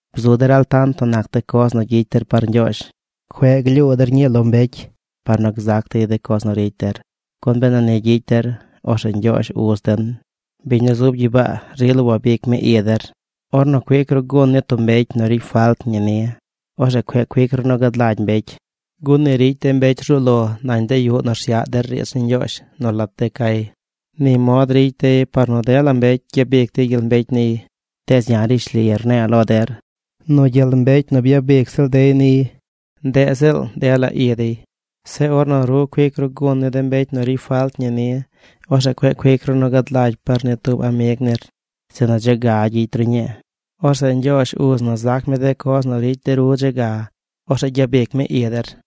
’Bzu der altant nu nac de coz nu gyicy der par Ñgyoozh. Cueꞌ glyuu der ñii lo mbecy par nu gzac dey coz nu ricy der, gun benu ni gyicy der, orzeꞌ Ñgyoozh, uz den, biñ nu zub gyibaa rila wabic mi i der. ’Ornu cuic ru gun ni tub mbecy nu ricy falt ñi ni, orzeꞌ cueꞌ cuic ru nu gad lagy mbecy. Gun ni ricy de mbecy rzuu lo nañ de yuꞌ nu rsyaꞌ der riidz ni Ñgyoozh nu lat de cay. Ni mod ricy dey par nu dela mbecy gyabic dey gyel mbecy niy. Tees ya̱ rishli rne̱e̱ lo der nu gyel mbecy nu byabic ziꞌl dey niy, ndeꞌ ziꞌl dela i dey. Zeꞌ ornu ru cuic ru gun ni mbecy nu ricy falt ñi ni, orzeꞌ cueꞌ cuic ru nu gad lagy par ni tub amig nir. Sinu dze ga gyicy ru ñii. Orzeꞌ Ñgyoozh uz na zac mi de coz nu ricy de ru dze ga. Orzeꞌ gyabic mi i der.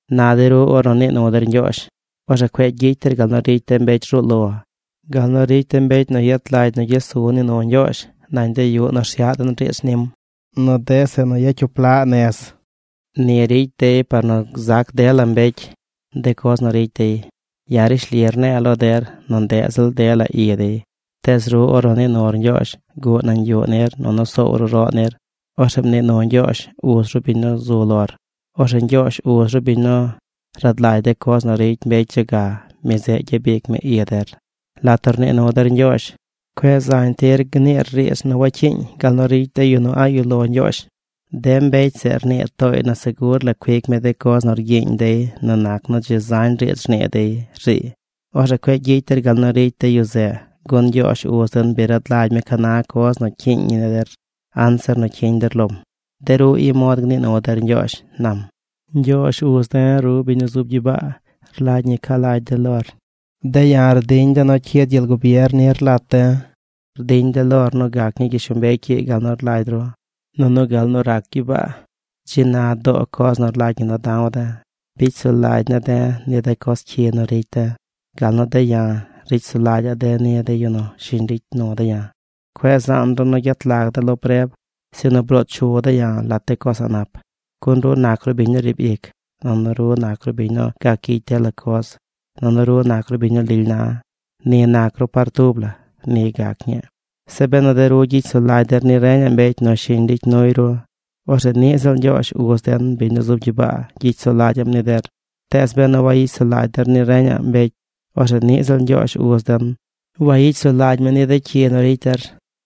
’Na de ru ornu nii nu der Ñgyoozh, orzeꞌ cueꞌ gyicy der gal nu ricy de mbecy rzuu lo, gal nu ricy de mbecy nu yet lagy nu gyes su nii nu Ñgyoozh nañ de yuꞌ nu rsyaꞌ den riidz nim, nu de zeꞌ nu yacyup laꞌ nez. Ni ricy dey par nu gzac dela mbecy de coz nu ricy dey. Ya̱ rishli rne̱e̱ lo der nu ndeꞌ ziꞌl dela i dey. Tees ru ornu nii nur Ñgyoozh, guꞌ nañ yuꞌ nir nunu soow ru roꞌ nir. Orzeꞌ mnii nu Ñgyoozh, uz ru, biñ nu zu lor. Orzeꞌ Ñgyoozh, uz ru, biñ nu rad lagy de coz nu ricy mbecy dze ga, mi zeꞌ gyabic mi i der. ’Lat nu rnii nu der Ñgyoozh, cueꞌ zañ tir gniir riidz nu wacyiiñ gal nu ricy de yu nu a̱ꞌ yuꞌ lo Ñgyoozh. De mbecy zeꞌ rnii tooy nu segur la cuic mi de coz nu rgyiiñ dey nu nac nu dzi zañ riidz rnii dey, rziiy. Orzeꞌ cueꞌ gyicy der gal nu ricy de yu zeꞌ, gun Ñgyoozh, uz den, bi rad lagy mi ca na coz nu cyiiñ ni der anzir nu cyiñ der lom. De ru, i mod gnii nu der Ñgyoozh ―nam―. Ñgyoozh, Uz de̱, ru biñ nu zub gyibaa. Rlagy ñi ca lagy de̱ lor. De̱ ya̱ rdiñ de̱ nu cyid gyel gubier nir lat de̱. Rdiñ de̱ lor nu gac ñii gyishlombecy ii gal nu rlagy ru, nunu gal nu rac gyibaa. Dzi na doo coz nu rlagy ñi nu da̱w de̱. Bicy sulagy ne̱ de̱ ni de coz cyi nu ricy de̱ gal nu de̱ ya̱, ricy sulagyaꞌ de̱ ni de yu nu shiñ ricy nu de̱ ya̱. Cueꞌ zaan ru nu gyet lag de̱ lo preb, sinu bloo chu de̱ ya̱ lat de coz a̱ꞌ nap. Gun ru nac ru biñ nu riib ic nunu ru nac ru biñ nu gac gyicy dela coz nunu ru nac ru biñ nu lily na. Ni nac ru par tub la. Ni gac ñii. ’Se benu de ru gyicy sulagy der ni reñaꞌ mbecy nu shiñ ricy nuy ru, orzeꞌ niꞌ ziꞌl Ñgyoozh, uz den, biñ nu zub gyibaa, gyicy sulagyaꞌm ni der. Tees benu wagyicy sulagy der ni reñaꞌ mbecy, orzeꞌ niꞌ ziꞌl Ñgyoozh, uz den, wayicy sulagy mi ni de cyi nu ricy der.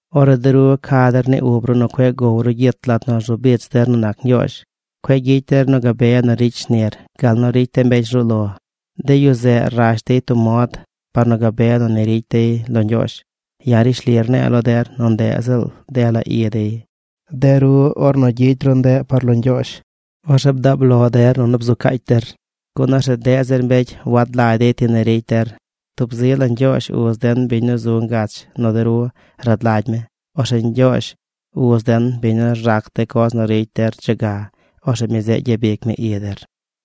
’Ornu de ru ca der ni ub ru nu cueꞌ gow ru gyit lat nu rzu bich der nu nac Ñgyoozh, cueꞌ gyicy der nu gabe nu ricy shnir gal nu ricy de mbecy rzuu lo. De yu zeꞌ rash dey tub mod par nu gabe nu ni ricy dey lo Ñgyoozh. Ya̱ rishli rne̱e̱ lo der nu ndeꞌ ziꞌl dela i dey. De ru, ornu gyicy ru ndeꞌ par lo Ñgyoozh, orzeꞌ bdaab lo der nunu bzu caacy der, gun orzeꞌ deꞌ zir mbecy wad lagy dey ti ni ricy der. Tub zi la Ñgyoozh, Uz den, biñ nu zu ngach nu de ru, rad lagy mi. Orzeꞌ Ñgyoozh, Uz den, biñ nu rzac de coz nu ricy der dze ga, orzeꞌ mi zeꞌ gyabic mi i der.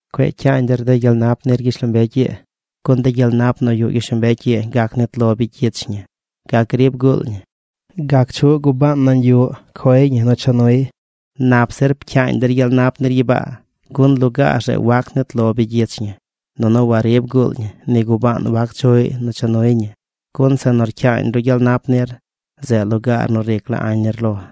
’Cueꞌ cyaañ der de gyel nap nir gyishlombecy ii, gun de gyel nap nu yuꞌ gyishlombecy ii gac gnit lo bigyich ñi, gac griib guul ñi, gac chuꞌ gubaan nañ yuꞌ coy ñi nu cha nuy. Nap zir pcyaañ der gyel nap nir gyibaa. Gun lugaar zeꞌ wac nit lo bigyich ñi, nunu warib guul ñi. Ni gubaan wac chuꞌy nu cha nuy ñi. Gun zeꞌ nu rcyaañ ru gyel nap nir, zeꞌ lugaar nu ric la añ nir lo.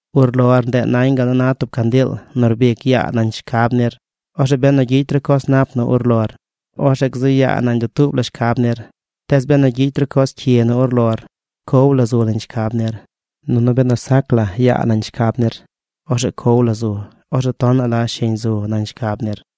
’Urlor, ndeꞌ nañ gal na tub candiil nu rbic yaa nañ shcab nir. Orzeꞌ benu gyicy ru coz nap nu urlor, orzeꞌ gzu yaa nañ dutuub la shcab nir. Tees benu gyicy ru coz cyi nu urlor, cow la zu nañ shcab nir. Nunu benu sac la yaa nañ shcab nir, orzeꞌ cow la zu. Orzeꞌ tonaꞌ la shiñ zu nañ shcab nir.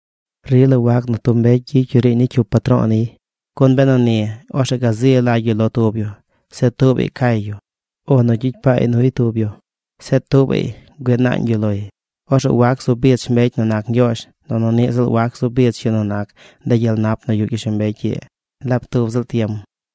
’Rila wac nu tub mbecy gyicy yu riiñ ni cyup patro̱o̱ niy, gun benu ni, orzeꞌ gazi lagy yu lo tub yu. Zeꞌ tuubaꞌy cay yu. O nu gyicy paay nuy tub yu. Zeꞌ tuubaꞌy güii naañ yu loy. Orzeꞌ wac zu bich mbecy nu nac Ñgyoozh, nunu niꞌ ziꞌl wac zu bich yu nu nac de gyel nap nu yuꞌ gyishlombecy ii laab tub ziꞌl tiem.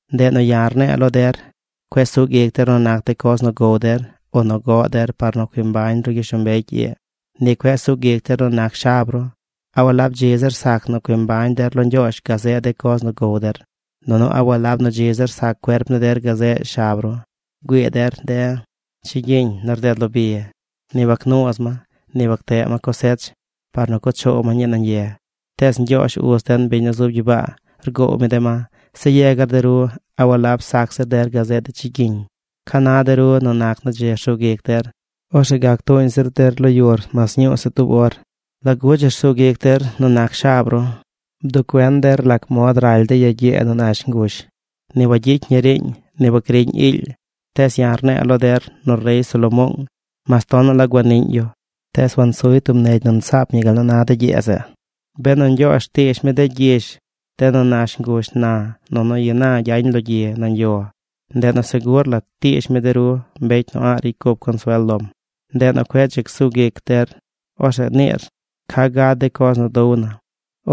’Ndeꞌ nu ya̱ rne̱e̱ lo der: Cueꞌ sug ic der nu nac de coz nu gow der o nu goꞌ der par nu cui mbañ ru gyishlombecy ii. Ni cueꞌ sug ic der nu nac shab ru. ¿A walab dzi zir sac nu cui mbañ der lo Ñgyoozh gazeꞌ de coz nu gow der? Nunu ¿a walab nu dzi zir sac cuerp ni der gazeꞌ shab ru? Güii der de chigyiñ nu rded lo bi. Ni wagnuuz ma. Ni wagteꞌ ma cosech par nu cuꞌ choow ma ñii nañ ye. Tees Ñgyoozh uz den, biñ nu zub gyibaa, rgoow mi de ma. Zeꞌ yegar de ru. ¿A walab sac zir der gazeꞌ de chigyiñ? ¿Ca na de ru nu nac nu dzi rsug ic der, orzeꞌ gac tuuñ zir der lo yur mas ñuu se tub or? ’¿Lagu dzi rsug ic der nu nac shab ru? Bduꞌ cuen der lac mod raly de ya gyee nu nash ngush. Ni wagyicy ñi riiñ. Ni wagriꞌñ iily. Tees ya̱ rne̱e̱ lo der nu rey Salomoong, mas tonaꞌ la guaniꞌñ yu, tees wansuy tub negy nu nsaap ñi gal nu na de gyee zeꞌ. Benu Ñgyoozh rtiish mi de gyish, de nu nash ngush na nunu ina gyañ lo gyi nañ yo, ndeꞌ nu segur la tiish mi de ru, mbecy nu a̱ꞌ ricy cup consuel lom. Ndeꞌ nu cueꞌ dzi csug ic der. Orzeꞌ niir: “¿Ca gad de coz nu dow na?”,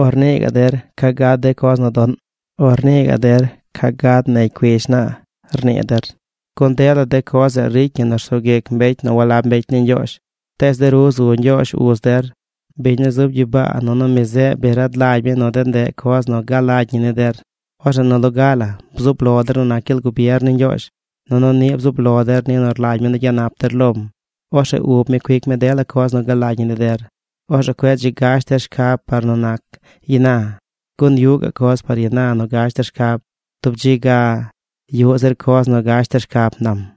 o rnii gaꞌ der: “¿Ca gad de coz nu doꞌn?” o rnii gaꞌ der: “¿Ca gad negy cuish naa?” rnii der. Gun dela de coz zeꞌ ricy ñi nu rsug ic mbecy nu walab mbecy ni Ñgyoozh. Tees de ru, zu Ñgyoozh uz der, biñ nu zub gyibaa nunu mi zeꞌ bi rad lagy mi nu de ndeꞌ coz nu galagy ñi ni der. Orzeꞌ nu loga la bzub lo der nu nac gyel gubier ni Ñgyoozh, nunu niꞌ bzub lo der ni nu rlagy mi nu gyanap der lom. Orzeꞌ ub mi cuic mi dela coz nu galagy ñi ni der. Orzeꞌ cueꞌ dzi gash der shab par nu nac ina, gun yuꞌ gaꞌ coz par ina nu gash der shcab. Tub dzi ga yuꞌ zir coz nu gash der shcab ―nam―.